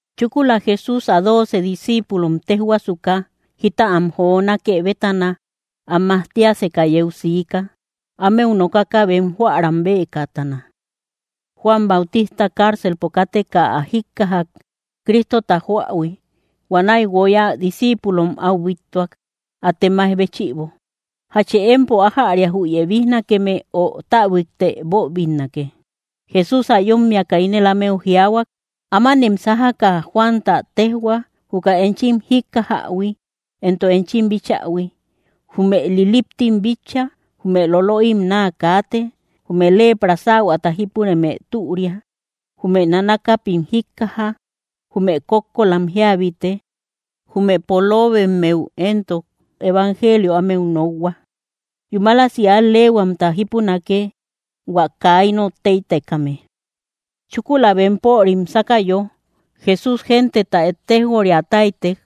Chúkula Jesús ä dooce discíipulom téjhuasuka jita am jonákë bétana, am majtiaseka yeu siika, ámeu nokaka bem jóäram beekatana. Juan Bautista cárcelpo káteka ä jíkkajak, Cristota joähui. Huanäi guoy ä discíipulom áu bíttuak, ä temay béchïbo: —¿Jachë empo ájäria jü yebijnakeme, ö täbuikte boobinnake? Jesús ä yómmiaka ínel ámeu jiaahuak: —Ámanem sájaka Juanta téjhua, juka enchim jíkkajähui entok enchim bíchähui. Jume liliptim bitcha, jume lolöim naa kaate, jume lepra sähuata jípureme türia, jume nanakapim jíkkaja, jume kókkolam jíabite, jume poloobemmeu éntok evangelio ámeu nokhua. Yúmalasi al‑leehuamta jípunake, hua kaa inot tëitekame. Chúkula bempörim sákayo, Jesús genteta ettejoria táytek,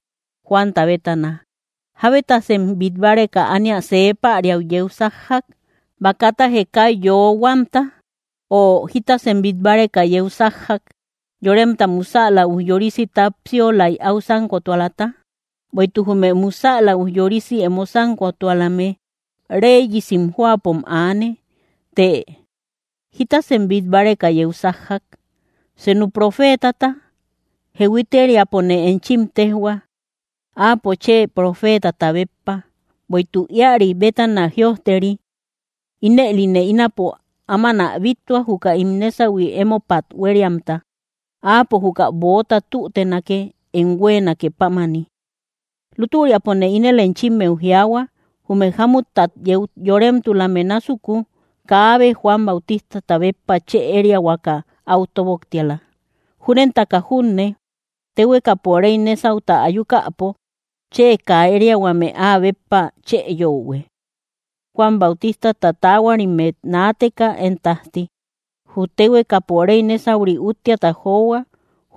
Juanta bétana: —¿Jábetasem bít báreka ánia see päriau yeu sájjak? ¿Bakata jekay yoohuamta? Ö, ¿jitasem bít báreka yeu sájjak? ¿Yoremta musäla ujyorisi tápsiolai áu sánkotualata? Bueïtuk jume musäla ujyorosi emo sánkotualame, réyesim jóapom aane. Të, ¿jitasem bít báreka yeu sájjak? ¿Senu profeetata? Jehuiteriapone enchim téjhua, áapo chë profeetata béppa. Bueïtuk íäri bétana jïojteri: Ínëline ínapo áman ä bíttua, juka ín nésahui émopat huériamta; Áapo juka böota tútenake, em huéenake pámani. Lútüriapone ínel enchimmeu jiaahua, jume jámuttat yeu yoremtulame násuku, kaabe Juan Bautistata béppa chë ériahuaka áu tóboktiala. Júnentaka junne, téhuekapo réy nésauta ayukäpo chë kaa ériahuame áa béppa chë yöhue. ’Juan Bautistata taahuarimet naateka én tájti, jü téhuekapo réy nésauri úttiata johua;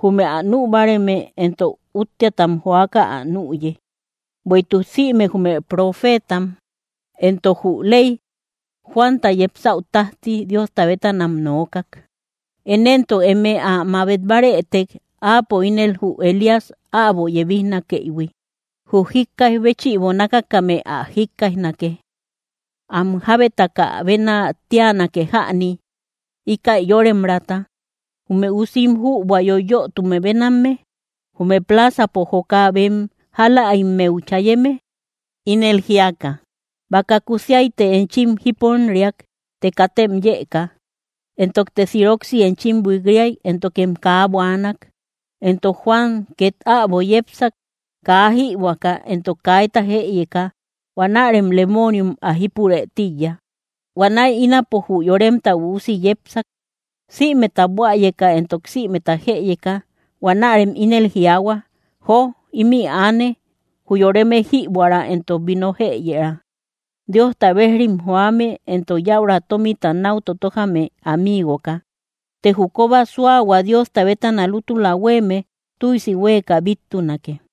jume ä nü báareme éntok úttiatam joaka ä nüye. Bueïtuk sïme jume profeetam entok jü ley, Juanta yepsäu tájti, Diosta bétanam nookak. Én éntok, eme ä mabet bárëtek, áapo ínel jü Elías äbo yebijnakëïhui. Jü jíkkaij béchïbo nákakame ä jikkaijnake. ’¿Am jábeta bénä tánake jäni, íkäi yóremraata? Jume usim jübua yoyötume bénamme; jume plaazapo joka bem jálaimmeu chayeme, ínel jíaka: “Baka kúsiayte enchim jiponriak, të katem yëka; entokte siroksi enchim buik‑riak, éntokem kaa buaanak.” Entok Juan két äbo yepsak, kaa jïbuäka entok kaita jëyeka; huanärem lemooniom ä jípurë tíiya. Huanäi ínapo jü Yoremta Üusi yepsak, sïmeta buäyeka entok sïmeta jëyeka; huanärem ínel jiaahua: “Jo ímï aane, jü yoreme jíbuära entok vino jëyëra; Diosta bejrim joame entok yäura tómita náu totójame amiigoka.” Të jü kóba súahua Diosta bétana lútula huéeme tüisi huéeka bíttunake.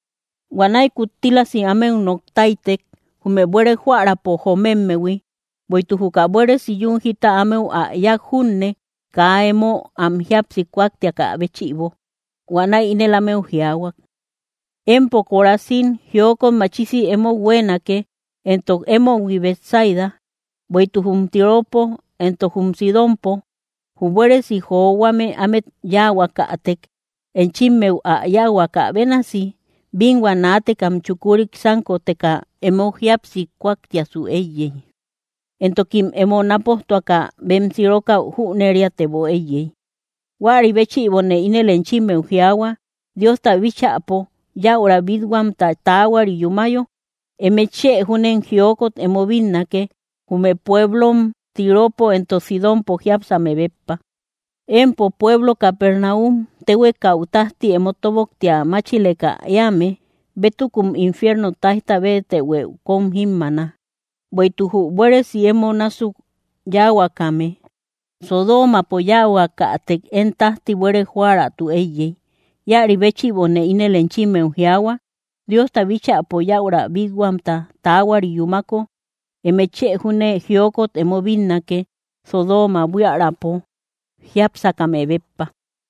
Huanäi kuttílasi ámeu nok táytek, jume buére jóärapo joomemmehui, bueïtuk juka buéresi yún jita ámeu ä yák junne, kaa emo am jíapsi kúaktiakä béchïbo. Huanäi ínel ámeu jiaahua: —¡Empo Corazín, jiokot machisi emou huéenake! Entok, ¡emohui Betsaida! Bueïtuk jum Tiropo entok jum Sidónpo jü buéresi johuame ámet yáahuakätek, enchimmeu ä yáahuakä bénasi, bínhua naatekam chukurik sánkoteka emo jíapsi kúaktiasu éiyey, entokim emo nápojtuaka bem sirokäu jüneriatebo éiyey. Huäri béchïbone ínel enchimmeu jiaahua, Diosta bíchäpo yäura bít-huamta taahuari yúmayo, eme chë júnem jiokot emo bínnake, jume pueblom Tiropo entok Sidónpo jiápsame béppa. Empo pueblo Capernaum, téhuekau tájti emo tóboktia máchileka éame, bétukum infierno táijta béetëhuë kóm jímmaana. Bueïtuk jü buéresi emo násuk yáahuakäme, Sodoomapo yáahuakätek, én tájti buére jóäraatu éiyey. Íäri béchïbone ínel enchimmeu jiaahua, Diosta bíchäpo yäura bít-huamta taahuari yúmako, eme chë júne jiokot emo bínnake, Sodooma buiärapo jiápsakame béppa.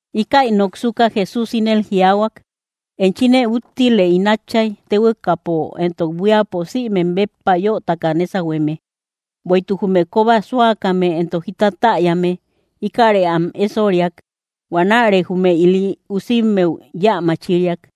Íkäi noksuka Jesús ínel jiaahuak: —Enchine úttile, ín Átchay, téhuekapo entok buíapo sïmem béppa yötaka nésahueme; bueïtuk jume kóba súakame entok jita täyame, íkäre am ésoriak. Huanäre jume ili usimmeu yä machiriak.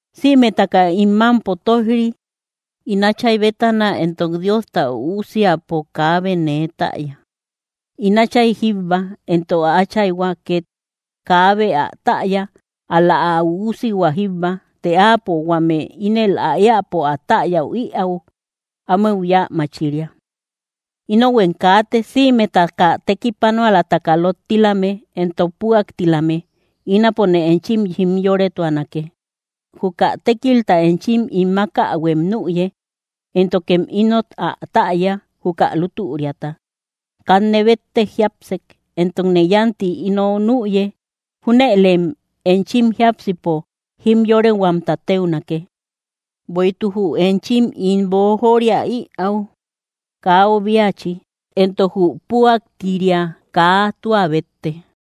’Sïmetaka im mámpo tóij‑ri, ín Áchay bétana; entok Diosta Üusiapo kaabe nee täya, ín Áchay jíbba, entok ä Áchayhua két kaabe ä täya; ál‑la ä Üusihua jíbba të Áapo huame ínel ä éäpo ä täya ïäu, ámeu yä machiria. Inohuem kaate, sïmetaka tekipanualataka lottilame entok püaktilame; ínapone enchim jimyoretuanake. Juka tékilta enchim ín mákähuem nüye, éntokem inot ä täya, juka lútüriata. Kanne béttek jiápsek, entokne yánti ino nüye; júnëlem enchim jiápsipo jimyorehuamta téunake. Bueïtuk jü enchim ín boojoria ïau kaa obiachi; entok jü püaktiria kaa tua bétte.